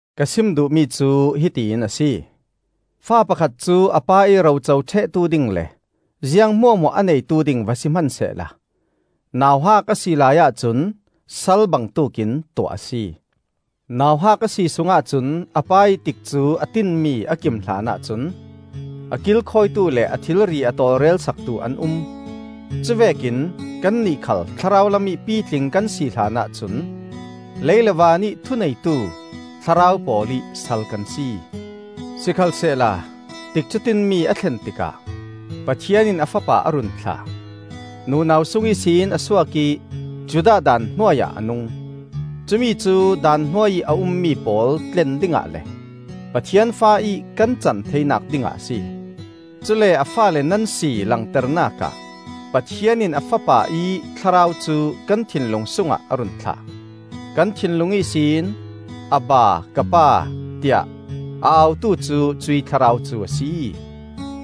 Ka sim duhmi cu hiti in a si: fa pakhat cu a pa ih ro co ṭhehtu ding le ziang hmuahhmuah a neitu ding va si hmansehla nauhak a si laiah cun sal bangtuk in tuah a si. Nauhak a si sungah cun a pa ih tikcu a tinmi a kim hlanah cun a kilkhawitu le a thilri a tawlrel saktu an um. Cuvekin kannih khal thlarau lamih pitling kan si hlanah cun lei le vanih thuneitu thlarau pawl ih sal kan si. Sikhalsehla tikcu tinmi a thlen tikah Pathian in a Fapa a run thlah. Nunau sung ihsin a suak ih Judah daan hnuai ah a nung. Cumi cu Daan hnuai ih a ummi pawl tlen dingah le Pathian fa ih kan can theinak dingah a si. Cule a faale nan si langternak ah Pathian in a Fapa ih Thlarau cu kan thinlung sungah a run thlah. Kan thinlung ihsin, “Abba, ka Pa,” tiah a autu cu cuih Thlarau cu a si.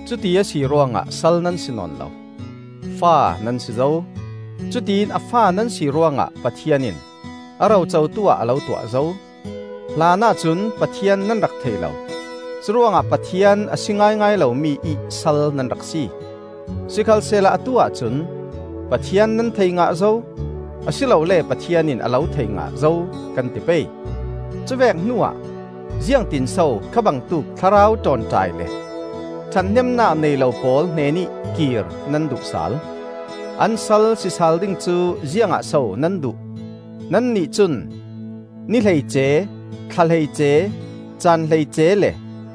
Cuti a si ruangah sal nan si nawn lo; fa nan si zo! Cutiin a fa nan si ruangah Pathian in a rocotu ah a lo tuah zo. Hlanah cun Pathian nan rak thei lo; curuangah Pathian a si ngaingai lomi ih sal nan rak si. Sikhalsehla atu-ah cun Pathian nan thei ngah zo, a si lole Pathian in a lo thei ngah zo, kan ti pei; cuvek hnuah ziangtinso kha bangtuk thlarau ṭawnṭai le ṭhathnemnak nei lo pawl hnenih kir nan duh sal? An sal si sal ding cu ziangah so nan duh? Nannih cun ni hleice, thla hleice, caan hleice, le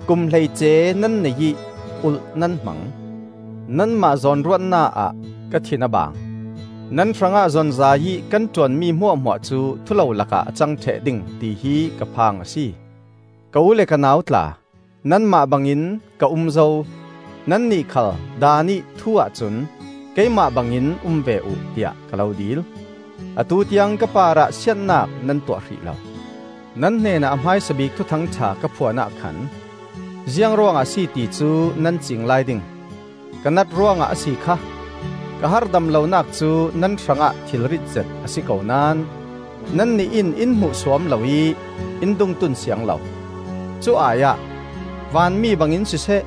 kum hleice nan nei ih ulh nan hmang. Nanmah zawn ruat na-ah ka thin a baang. Nan hrangah zonzai ih kan ṭuanmi hmuahhmuah cu thulolak ah a cang ṭheh ding tihi ka phang a si. Ka u le ka nau tla, nanmah bangin ka um zo; nannih khal Daan ih thu ahcun keimah bangin um ve uh, tiah ka lo dil. Atu tiang ka parah siatnak nan tuah hrih lo. Nan hnenah a hmaisa bik Thuthang ṭha ka phuan ah khan ziangruangah a si ti cu nan ciing lai ding; ka nat ruangah a si kha! Ka harhdam lonak cu nan hrangah thilrit zet a si ko naón nannih in in hmuhsuam lo ih in dungtun siang lo. Cu ai-ah vanmi bangin siseh,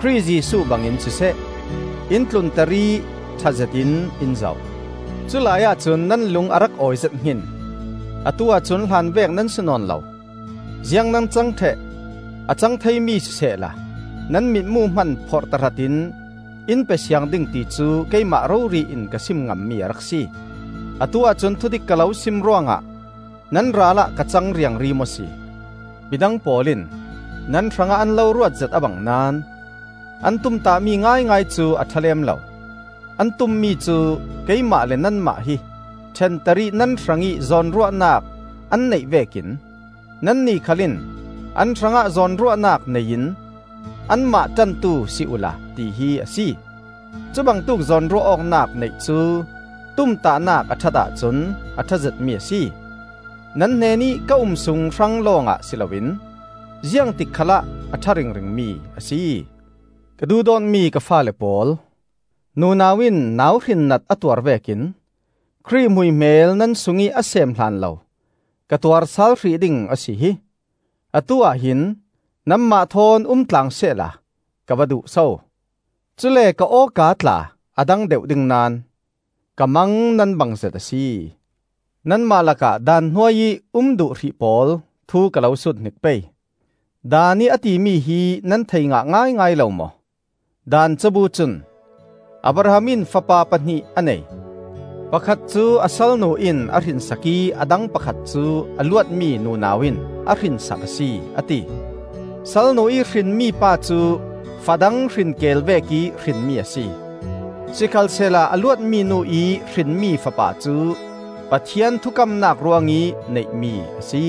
Khrih Jesuh bangin siseh, in tlunter ih ṭha zetin in zoh. Culai ahcun nan lung a rak awizet hngin! Atu-ah cun hlanvek nan si nawn lo. Ziang nan cang ṭheh? A cang theimi sisehla nan mitmu hman phorh tahratin in pe siang ding ti cu keimah rori in ka sim ngammi a rak si. Atu-ah cun thudik ka lo sim ruangah nan ralah ka cang riangri maw si? Midang pawl in nan hrangah an lo ruatzet a bang naón an tumtahmi ngaingai cu a ṭha lem lo. An tummi cu keimah le nanmah hi ṭhenter ih nan hrangih zawnruahnak an neih vekin nannih khal in an hrangah zawnruahnak nei in anmah ṭantu si uhla tihi a si. Cubangtuk zawnruah awknak neih cu tumtahnak a ṭhat ahcun a ṭha zetmi a si. Nan hnenih ka um sung hrang lawngah si loin ziangtik khalah a ṭha ringringmi a si. Ka duhdawtmi ka faale pawl, nunau in nauhrinnat a tuar vekin Khrih hmuihmel nan sungih a seem hlanlo ka tuar sal hrih ding a si hi! Atu-ah hin nanmah thawn umtlang sehla ka va duh so; cule ka aw-ka tla a dang deuh ding naón! Ka mang nan bangzet a si. Nanmah lakah Daan hnuai ih um duh hrih pawl thu ka lo sut hnik pei: Daan ih a timi hi nan thei ngah ngaingai lo maw? Daan cabu cun, Abraham in fapa pahnih a nei; pakhat cu a salnu in a hrinsak ih a dang pakhat cu a luatmi nunau in a hrinsak a si, a ti. Salnu ih hrinmi pa cu fa dang hrin keel vekih hrinmi a si; sikhalsehla a luatmi nu ih hrinmi fapa cu Pathian thukamnak ruangih neihmi a si.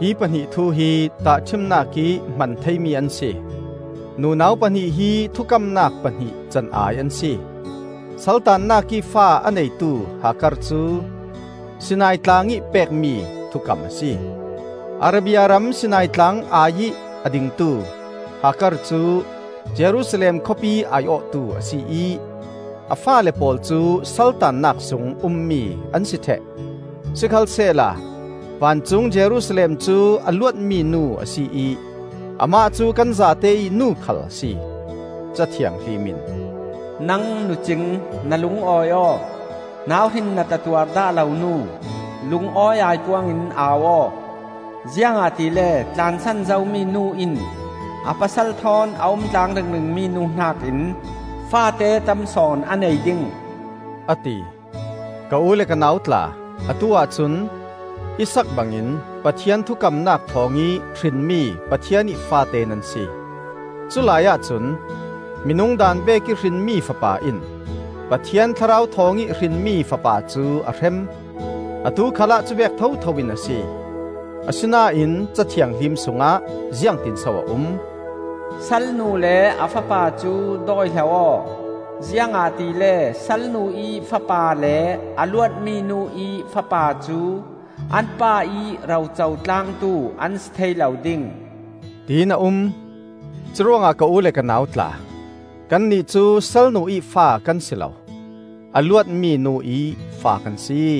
Hi pahnih thu hi tahṭhimnak ih hman theimi an si. Nunau pahnih hi thukamnak pahnih can-ai an si. Saltannak ih fa a neitu Hagar cu Sinai tlang ih pek mi thukam a si. Arabia ram Sinai tlang ai-ih a dingtu Hagar cu Jerusalem khawpi ai-awhtu a si ih a faale pawl cu saltannak sung ummi an si ṭheh. Sikhalsehla vancung Jerusalem cu a luatmi nu a si ih amah cu kan zate ih nu khal a si. Ca Thianghlim in, “Nang nucing, na lungawi aw! Nauhrinnat a tuar dah lo nu, lungawi aipuang in au aw! Ziangahtile tlansan zomi nu in a pasal thawn a umtlang ringring mi nu hnakin faate tam sawn a nei ding,” a ti. Ka u le ka nau tla, atu-ah cun Isaak bangin Pathian thukamnak thawngih hrinmi Pathian ih faate nan si. Culai ahcun minung daan vekih hrinmi fapa in Pathian Thlarau thawngih hrinmi fapa cu a hrem. Atu khalah cuvek thotho in a si. Asinain Ca Thianghlim sungah ziangtinso a um? “Salnu le a fapa cu dawihlo aw; ziangahtile salnu ih fapa le a luatmi nu ih fapa cu an pa ih roco tlangtu an si thei lo ding,” tin a um. Curuangah ka u le ka nau tla, kannih cu salnu ih fa kan si lo, a luatmi nu ih fa kan si.